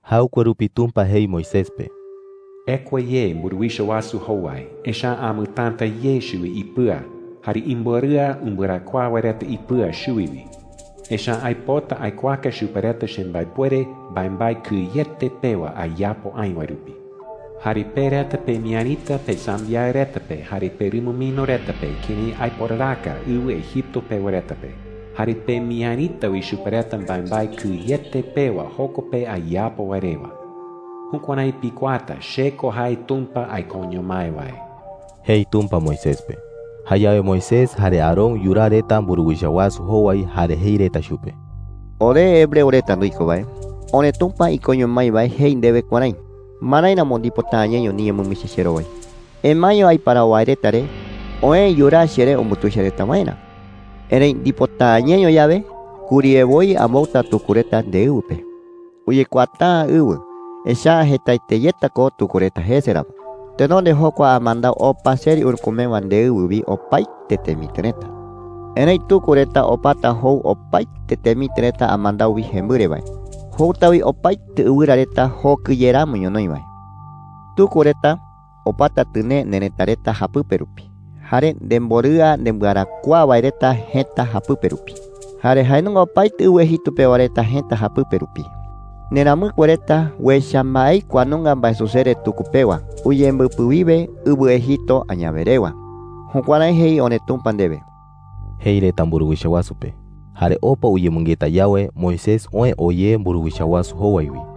Jaɨkue rupi Tumpa jei Moisés pe: “Ekua ye mburuwicha wasu jowai, echa’ä amɨtäta ye chuwi ipɨa jare imborɨa umbɨarakuaa wae reta ipɨa chuwi wi. Echa’ä aipota aikuaaka chupe reta chembaepuere mbaembae kɨyete pewa ayapo aï wae rupi,” jei chupe. “Jare pe reta pemiärita pesambiaɨ reta pe jare perumɨmino reta pe kërái aiporaraka ɨwɨ Egipto pewa reta pe. Jare pemiärita wi chupe reta mbaembae kɨyete pewa joko pe ayapo wae rewa. Jukuärái pikuaata che ko jae Tumpa aikoño mái wae,” jei Tumpa Moisés pe. Jayawe Moisés jare Aarón yuraa reta mburuwicha wasu jowai, jare jei reta chupe: “Ore hebreo reta nduiko wae, oreTumpa ikoño mái wae jei ndewe kuärái: “¿Marái ramo ndipota’ä ñeño niñemɨmichi cherowai? Emaeño aiparawo wae reta re oë yuraa cheree umbutuicha reta waerä. Erëi ndipota’ä ñeño yawe, kuriye woi ambouta tuku reta ndeɨwɨ pe. Uyekuaata’ä ɨwɨ, echa’ä jetaete yeta ko tuku reta jese ramo. Tenonde jokua amandau opa seri urükumewa ndeɨwɨ wi opaete temitɨ reta. Erëi tuku reta opata jou opaete temitɨ reta amandau wi jembɨre wae. Jouta wi opaete ɨwɨra reta jokɨ ye ramo ñonoï wae. Tuku reta opata tɨnee nerëta reta japɨpe rupi, jare nemborɨa nembɨarakuaa wae reta jëta japɨpe rupi, jare jae nunga wi opaete ɨwɨ Egipto pewa reta jëta japɨpe rupi. Nderamɨkue reta uecha mbaei kua nunga mbaesusere tuku pewa uyembɨpɨ wiwe ɨwɨ Egipto añawe rewa.’ Jukuärái jei oreTumpa ndewe,” jei Moisés mburuwicha wasu pe. Jare opa uyemɨngeta yawe, Moisés oë oo ye mburuwicha wasu jowai wi.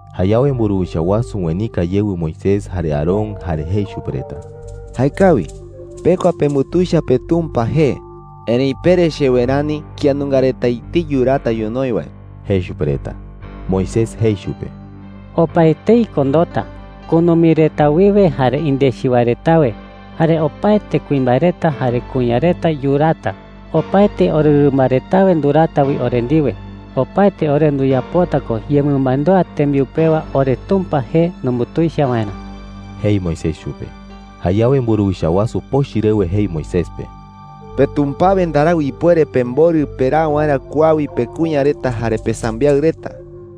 Jayawe mburuwicha wasu uenika yewɨ Moisés jare Aarón, jare jei chupe reta: “Jaekawi. Pekua pembutuicha peTumpa jee. Erëi pere chewe rani kía nunga reta etei yuraata ñonoï wae,” jei chupe reta. Moisés jei chupe: “Opaetei ko ndoota. Kunumi reta wiwe jare indechi wae retawe, jare opaete kuimbae reta jare kuña reta yuraata. Opaete orerɨmba retawe nduraata wi ore ndiwe. Opaete ore nduyapota ko yemɨmandúa tembiu pewa oreTumpa jee numbutuicha waerä,” jei Moisés chupe. Jayawe mburuwicha wasu pochɨ rewe jei Moisés pe: “¡PeTumpawe ndarau ipuere pemborɨ peraa waerä kua wi pekuña reta jare pesambiaɨ reta,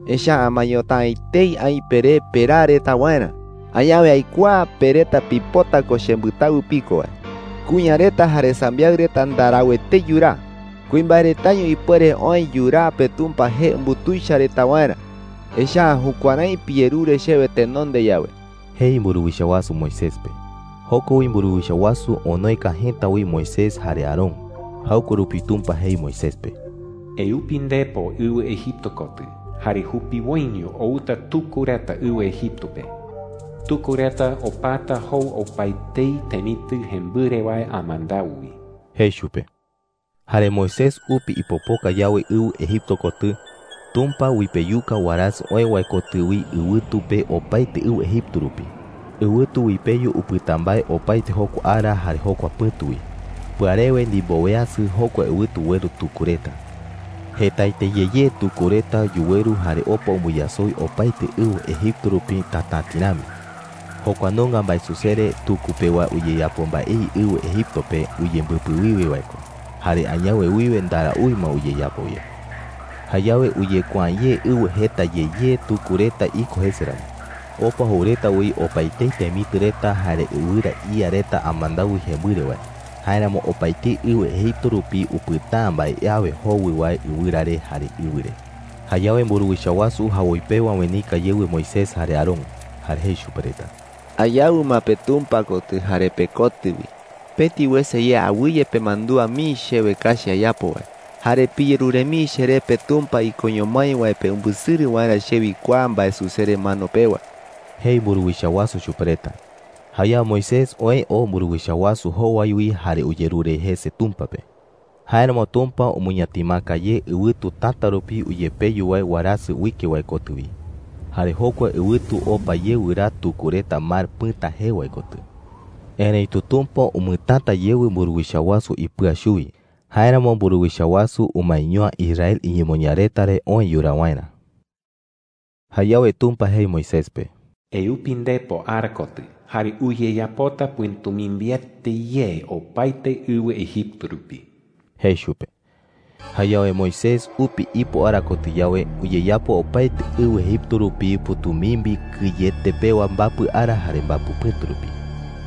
echa’ä amaeñota’ä etei aï peré peraa reta waerä! ¡Añawe aikuaa pe reta pipota ko chembɨtawɨ piko wae!” jei chupe. “¡Kuña reta jare sambiaɨ reta ndarau etei yuraa! Kuimbae retaño ipuere oë yuraa peTumpa jee umbutuicha reta waerä, echa’ä jukuärái piyerure chewe tenonde yawe,” jei mburuwicha wasu Moisés pe. Joko wi mburuwicha wasu onoeka jëta wi Moisés jare Aarón. Jaɨkue rupi Tumpa jei Moisés pe: “Eupi ndepo ɨwɨ Egipto kotɨ, jare jupiwoiño outa tuku reta ɨwɨ Egipto pe. Tuku reta opata jou opaetei temitɨ jembɨre wae amandau wi,” jei chupe. Jare Moisés upi ipopoka yawe ɨwɨ Egipto kotɨ, Tumpa uipeyuka warasɨ oë wae kotɨ wi ɨwɨtu pe opaete ɨwɨ Egipto rupi. Ɨwɨtu uipeyu upɨta mbae opaete jokua ara jare jokua pɨ̈tu wi. Pɨarewe ndimboweasɨ, jokua ɨwɨtu ueru tuku reta. Jetaete ye ye tuku reta yuweru jare opa umbɨyasoi opaete ɨwɨ Egipto rupi tatäti rami. Jokua nunga mbaesusere tuku pewa uyeyapo mbaei ɨwɨ Egipto pe uyembɨpɨ wiwe wae ko, jare añawe wiwe ndaraúi ma uyeyapo ye. Jayawe uyekuaa’ä ye ɨwɨ jeta ye ye tuku reta iko jese ramo. Opa jou reta wi opaetei temitɨ reta jare ɨwɨra ía reta amandau wi jembɨre wae. Jáeramo opaetei ɨwɨ Egipto rupi upɨta’ä mbae awe jowɨ wae ɨwɨra re jare ɨwɨ re. Jayawe mburuwicha wasu jawoi pewa uenika yewɨ Moisés jare Aarón, jare jei chupe reta: “Ayawɨ ma peTumpa kotɨ jare pekotɨ wi. Pëti wese ye awɨye pemandúa mii chewe kachi ayapo wae, jare piyerure mii cheré peTumpa ikoño mái wae pe umbɨsɨrɨ waerä chewi kua mbaesusere mano pewa,” jei mburuwicha wasu chupe reta. Jayawe Moisés oë oo mburuwicha wasu jowai wi jare uyerure jese Tumpa pe. Jáeramo Tumpa umɨñatimaka ye ɨwɨtu täta rupi uyepeyu wae warasɨ uike wae kotɨ wi, jare jokua ɨwɨtu opa ye wɨraa tuku reta Mar Pɨ̈ta jee wae kotɨ. Erëitu Tumpa umɨtäta yewɨ mburuwicha wasu ipɨa chuwi. Jáeramo mburuwicha wasu umaeño’ä Israel iñemoñaa reta re oë yuraa waerä. Jayawe Tumpa jei Moisés pe: “Eupi ndepo ara kotɨ, jare uyeyapota pɨ̈tumimbiete ye opaete ɨwɨ Egipto rupi,” jei chupe. Jayawe Moisés upi ipo ara kotɨ yawe, uyeyapo opaete ɨwɨ Egipto rupi pɨ̈tumimbi kɨyete pewa mbapɨ ara jare mbapɨ pɨ̈tu rupi.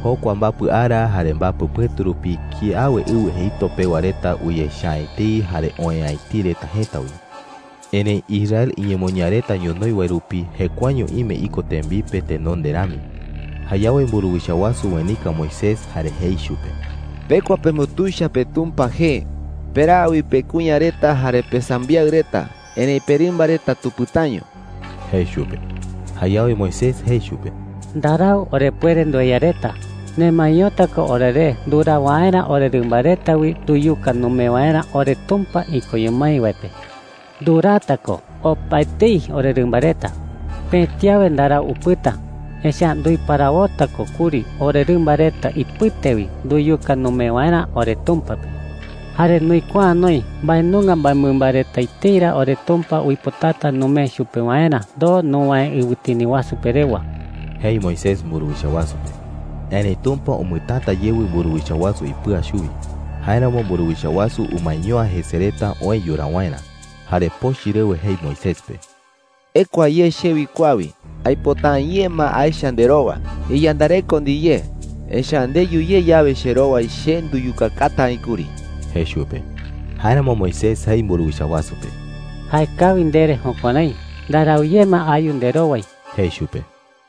Jokua mbapɨ ara jare mbapɨ pɨ̈tu rupi kiawe ɨwɨ Egipto pewa reta uyecha’ä etei jare oë'ä etei reta jëta wi. Erëi Israel iñemoñaa reta ñonoï wae rupi jekuaeño ime iko tembipe tenonde rami. Jayawe mburuwicha wasu uenika Moisés jare jei chupe: “Pekua pembutuicha peTumpa jee. Peraa wi pekuña reta jare pesambiaɨ reta. Erëi perɨmba reta tupɨtaño,” jei chupe. Jayawe Moisés jei chupe: “Ndarau orepuere ndueya reta,” jei. “Nemaeñota ko oreré nduraa waerä orerɨmba reta wi nduyuka numee waerä oreTumpa ikoño mái wae pe. Nduraata ko opaetei orerɨmba reta. Pëti awe ndarau upɨta, echa’ä nduiparawota ko kuri orerɨmba reta ipɨte wi nduyuka numee waerä oreTumpa pe. Jare nduikuaa’ä noï mbae nunga mbaemɨmba reta etei ra oreTumpa uipotata numee chupe waerä ndoo nuwäe ɨwɨtini wasu pe rewa,” jei Moisés mburuwicha wasu pe. Erëi Tumpa umɨtäta yewɨ mburuwicha wasu ipɨa chuwi. Jáeramo mburuwicha wasu umaeño’ä jese reta oë yuraa waerä. Jare pochɨ rewe jei Moisés pe: “¡Ekua ye chewi kua wi! ¡Aipota’ä ye ma aecha nderowa! ¡Iyandareko ndiyé, echa’ä ndeyu ye yawe cherowai, che nduyukakata aï kuri!” jei chupe. Jáeramo Moisés jei mburuwicha wasu pe: “Jaekawi ndere jukuärái. Ndarau ye ma ayu nderowai,” jei chupe.